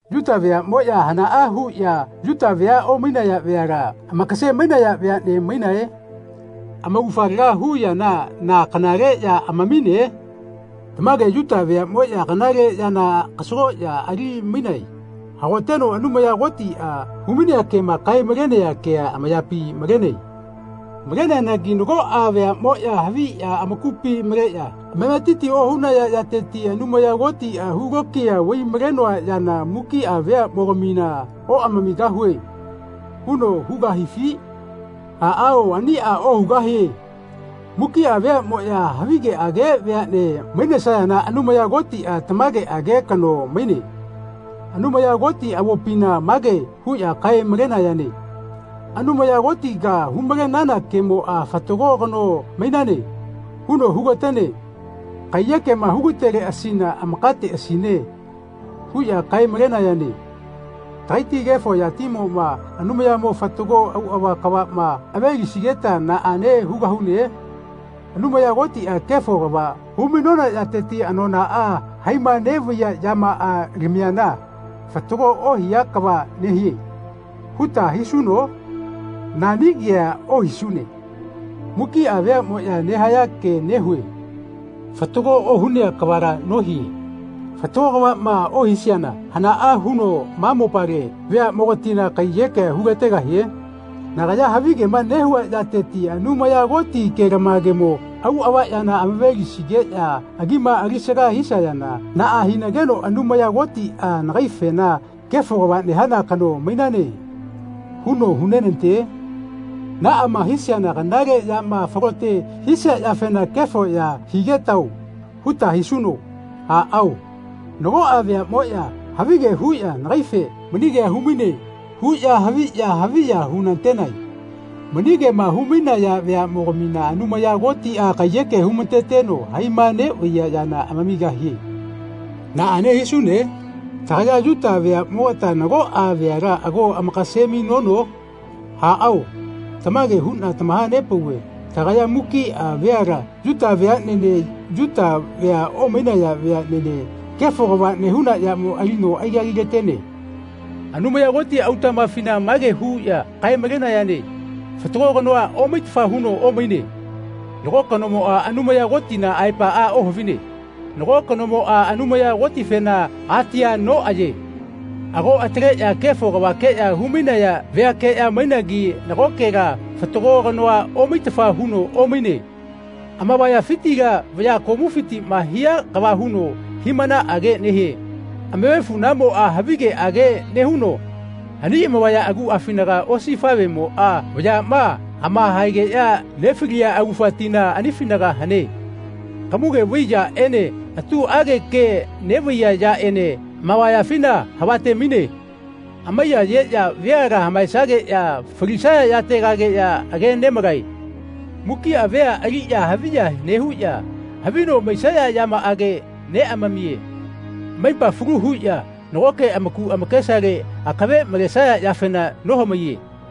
Yuta veaꞌmoꞌya hanaꞌa huꞌya Yuta vea omainaya veala amakase-mainaya veaꞌne mainae? Amaugafa laga hu yamoꞌa na kanale ya amamine? Tamage Yuta veaꞌmoꞌya kanale yana kasagoꞌya alimainae. Hagoteno Anumaya Kotiꞌa humainea kema kae-malenaya kea amayapi malene. Maleneanagi nagoꞌa veaꞌmoꞌya haviꞌya amakupi maleꞌya amametiti ohunaya yateti Anumaya Kotiꞌa “Hulokiya vaimalenoa yana mukiꞌa veaꞌmogamina oꞌamamigahue.” huno hugahifi? Aꞌao aniꞌa ohugahie. Mukiꞌa veaꞌmoꞌya havigeꞌage veaꞌne mainesayana Anumaya Kotiꞌa tamageꞌage kano maine. Anumaya Koti avopina mage huꞌya kae-malenayane “Anumaya Kotiga humalenana kemoꞌa ‘Fatago kano mainane.’ huno hugatene. Kaiyekema hugateleꞌasina amakasateꞌasine.” huꞌya kae-malenayane. Tagaiti kefo yatimoꞌma Anumayamo fatago auꞌava kavaꞌma avelisigeta naꞌane hugahune? Anumaya Kotiꞌa kefo kava humainona yateti anonaꞌa haima neꞌvaiya yamaꞌa lamiana “Fatago ohia kava nehie.” huta hisuno? Nani kea ohisune. Mukiꞌa veaꞌmoꞌya nehaya ke nehue. Fatago ohunea kavala nohie. Fatago kavaꞌma ohisiana hanaꞌa huno ma mopale veaꞌmogatina kaiyekea hulategahie? Nagaya havigema nehua yateti Anumaya Koti kelamagemo auꞌava yana amave-lisigeꞌya agima alisaga hisayana naꞌa hinageno Anumaya Kotiꞌa nagaifena “Kefo kava nehana kano mainane.” huno hunenate? Naꞌama hisiana “Kanale yama falote hisia yafena kefo ya higetao.” huta hisuno. Aꞌao, nagoꞌa veaꞌmoꞌya havige huꞌya nagaife “Mani kea humaine.” huꞌya haviꞌya haviya-hunatenae. Mani kema humainaya veaꞌmogamina Anumaya Kotiꞌa kaiyeke humateteno haima neꞌvaiya yana amamigahie. Naꞌane hisune? Tagaya Yuta veaꞌmogata nagoꞌa veala ago amakase-mainono? Aꞌao, tamage huꞌna tamahapauve tagaya mukiꞌa veala Yuta veaꞌnene Yuta vea omainaya veaꞌnene kefo kava nehuna yamo alino aikagilatene. Anumaya Koti autaꞌmafina mage huꞌya kae-malenayane “Fatago kanoa omaitafa huno omaine. Nago kanomoꞌa Anumaya Kotina aepaꞌa ohavine. Nago kanomoꞌa Anumaya Kotifena atia noꞌaye. Ago ataleꞌya kefo kavakeꞌya humainaya veakeꞌya mainagi nagokela fatago kanoa omaitafa huno omaine. Amavayafitila vaya komufitiꞌma hia kava huno hiꞌmanaꞌage nehie. Amavefuꞌnamoꞌa havigeꞌage nehuno ani amavaya aguꞌafinaga osifaꞌvemoꞌa vayaꞌma amahaegeꞌya nefaliya augafa tina anifinaga hane. Kamuge vai yaꞌene atuꞌage ke neꞌvaiya yaꞌene amavayafina havate-maine. Amaiyayeꞌya veala hamaesageꞌya falisaya yategageꞌya age nemalae. Mukiꞌa vea aliꞌya haviya nehuꞌya havi no maisaya yamaꞌage neꞌamamiye. Amaipa falu huꞌya nagoke amaku amakesale akave malesaya yafena nohamaiye.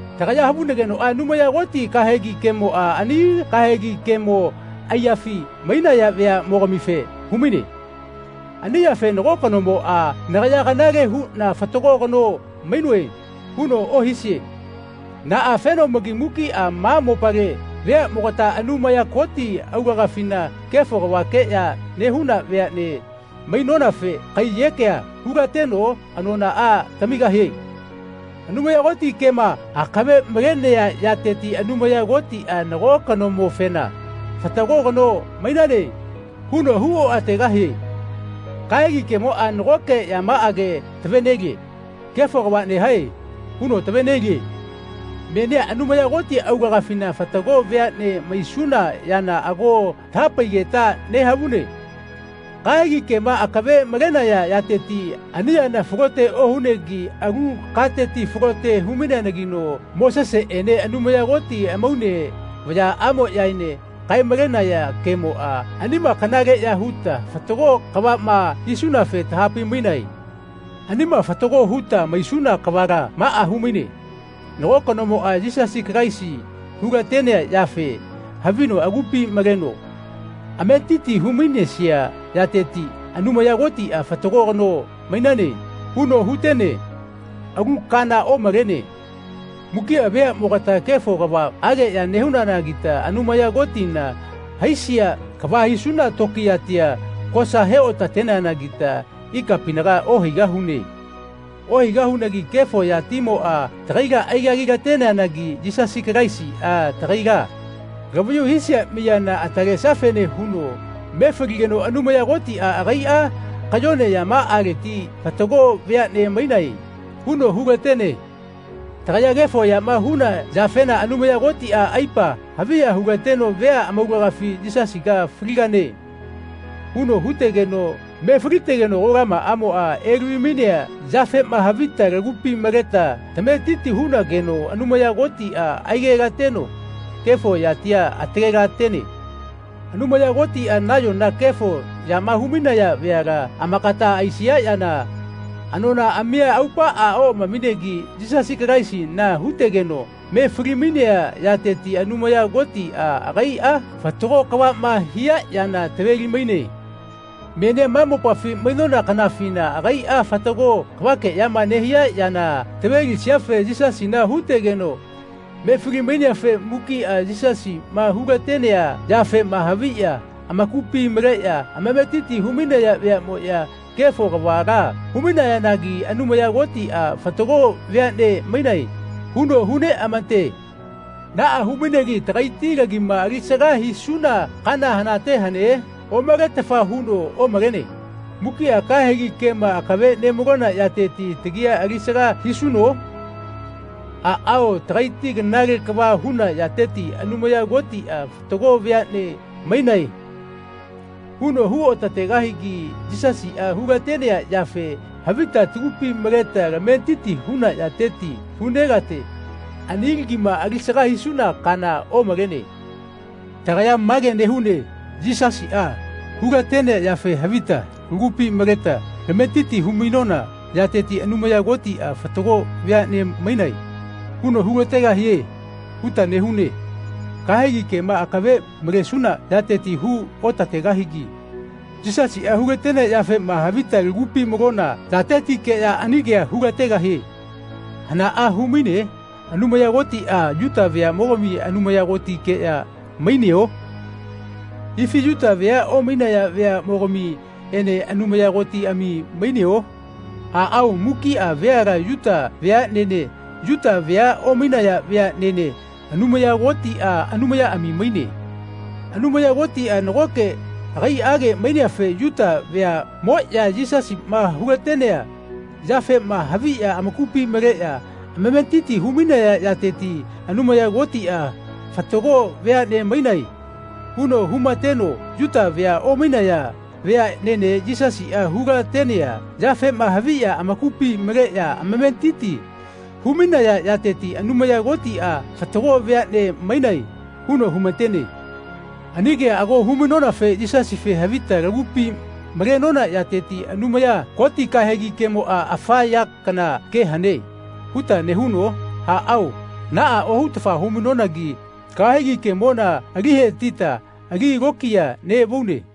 Tagaya havunagenoꞌa Anumaya Koti kahegi kemoꞌa ani kahegi kemo aiyafi mainaya veaꞌmogamife humaine. Ani yafe nago kanomoꞌa “Nagaya kanale huꞌna fatago kano mainoe.” huno ohisie. Naꞌafenomagi mukiꞌa ma mopale veaꞌmogata Anumaya Koti aulagafina kefo kavakeꞌya nehuna veaꞌne mainonafe kaiyekea hulateno anonaꞌa tamigahie. Anumaya Koti kema akave malenea yateti Anumaya Kotiꞌa nago kanomofena “Fatago kano mainane.” huno hu oꞌategahie. Kahegi kemoꞌa nagoke yamaꞌage tavenelie. “Kefo kava nehae.” huno tavenelie. Menia Anumaya Koti aulagafina fatago veaꞌne maisuna yana ago tahapaigeta nehavune. Kahegi kema akave malenaya yateti ani yana falote ohunegi alu kateti falote humaineanagino Moseseꞌene Anumaya Koti amaune vayaꞌmoꞌyaene kae-malenaya kemoꞌa anima kanale ya huta fatago kavaꞌma hisunafe tahapaimainae. Anima fatago huta maisuna kavala maꞌa humaine, nago kanomoꞌa Yisasi Kalaisi hulatenea yafe havino agupi maleno ametiti humainesia yateti Anumaya Kotiꞌa “Fatago kano mainane.” huno hutene. Alu kana omalene. Mukiꞌa veaꞌmogata kefo kavaꞌageꞌya nehunanagita Anumaya Kotina haisia kava hisuna tokiyatia kosa he-otateneanagita ikapinaga ohaigahune. Ohaigahunagi kefo yatimoꞌa tagaila aikagilateneanagi Yisasi Kalaisiꞌa tagaila lavayu hisia miyana atalesiafene huno me faligeno Anumaya Kotiꞌa agaiꞌa kayone yamaꞌaleti “Fatago veaꞌne mainae.” huno hulatene. Tagaya kefo yama huna yafena Anumaya Kotiꞌa aipa haviya hulateno vea amaulagafi “Yisasiga faligane.” huno hutegeno me falitegeno kolamaꞌamoꞌa elavi-mainea yafema havita tagupi maleta tametiti hunageno Anumaya Kotiꞌa aigetateno kefo yatia atalelatene. Anumaya Kotiꞌa nayona kefo yama humainaya veala amakata aisia yana anonaꞌamia aupaꞌa oꞌamaminegi Yisasi Kalaisina hutegeno me falimainea yateti Anumaya Kotiꞌa agaiꞌa fatago kavaꞌma hia yana taveli-maine. Menia ma mopafi mainona kanafina agaiꞌa fatago kavakeꞌyama nehia yana tavelisiafe Yisasina hutegeno me fali-maineafe mukiꞌa Yisasiꞌma hulatenea yafema haviꞌya amakupi maleꞌya amametiti humainaya veaꞌmoꞌya kefo kavala humainayanagi Anumaya Kotiꞌa “Fatago veaꞌne mainae.” huno huneꞌamate. Naꞌa humainegi tagaiti lagima alisaga hisuna kaana hanate hane? Omaletafa huno omalene. Mukiꞌa kahegi kema akave nemalona yateti tagia alisaga hisuno? Aꞌao, tagaiti kanale kava huna yateti Anumaya Kotiꞌa “Fatago veaꞌne mainae.” huno huotatenegi Yisasiꞌa hulatenea yafe havita tagupi maleta tametiti huna yateti hunelate. Ani lagima alisaga hisuna kaana omalene. Tagaya mage nehune Yisasiꞌa hulatenea yafe havita lagupi maleta tametiti humainona yateti Anumaya Kotiꞌa “Fatago veaꞌne mainae.” huno hulategahie huta nehune. Kahegi kema akave malesuna yateti hu otategahigi Yisasiꞌa hulatenea yafema havita tagupi malona yatetikeꞌya ani kea hulategahie. Hanaꞌa humaine? Anumaya Kotiꞌa Yuta veaꞌmogami Anumaya Kotikeꞌya maineo? Ifi Yuta vea omainaya veaꞌmogamiꞌene Anumaya Kotiꞌami maineo? Aꞌao, mukiꞌa veala Yuta veaꞌnene Yuta vea omainaya veaꞌnene Anumaya Kotiꞌa Anumayaꞌami maine. Anumaya Kotiꞌa nagoke agaiꞌage maineafe Yuta veaꞌmoꞌya Yisasiꞌma hulatenea yafema haviꞌya amakupi maleꞌya amametiti humainaya yateti Anumaya Kotiꞌa “Fatago veaꞌne mainae.” huno humateno Yuta vea omainaya veaꞌnene Yisasiꞌa hulatenea yafema haviꞌya amakupi maleꞌya amametiti humainaya yateti Anumaya Kotiꞌa “Fatago veaꞌne mainae.” huno humatene. Ani kea ago humainonafe Yisasife havita lagupi malenona yateti “Anumaya Koti kahegi kemoꞌa afa ya kana ke hane.” huta nehuno? Aꞌao naꞌa ohutafa humainonagi kahegi kemona ali hetita ali lokiya neꞌvaune.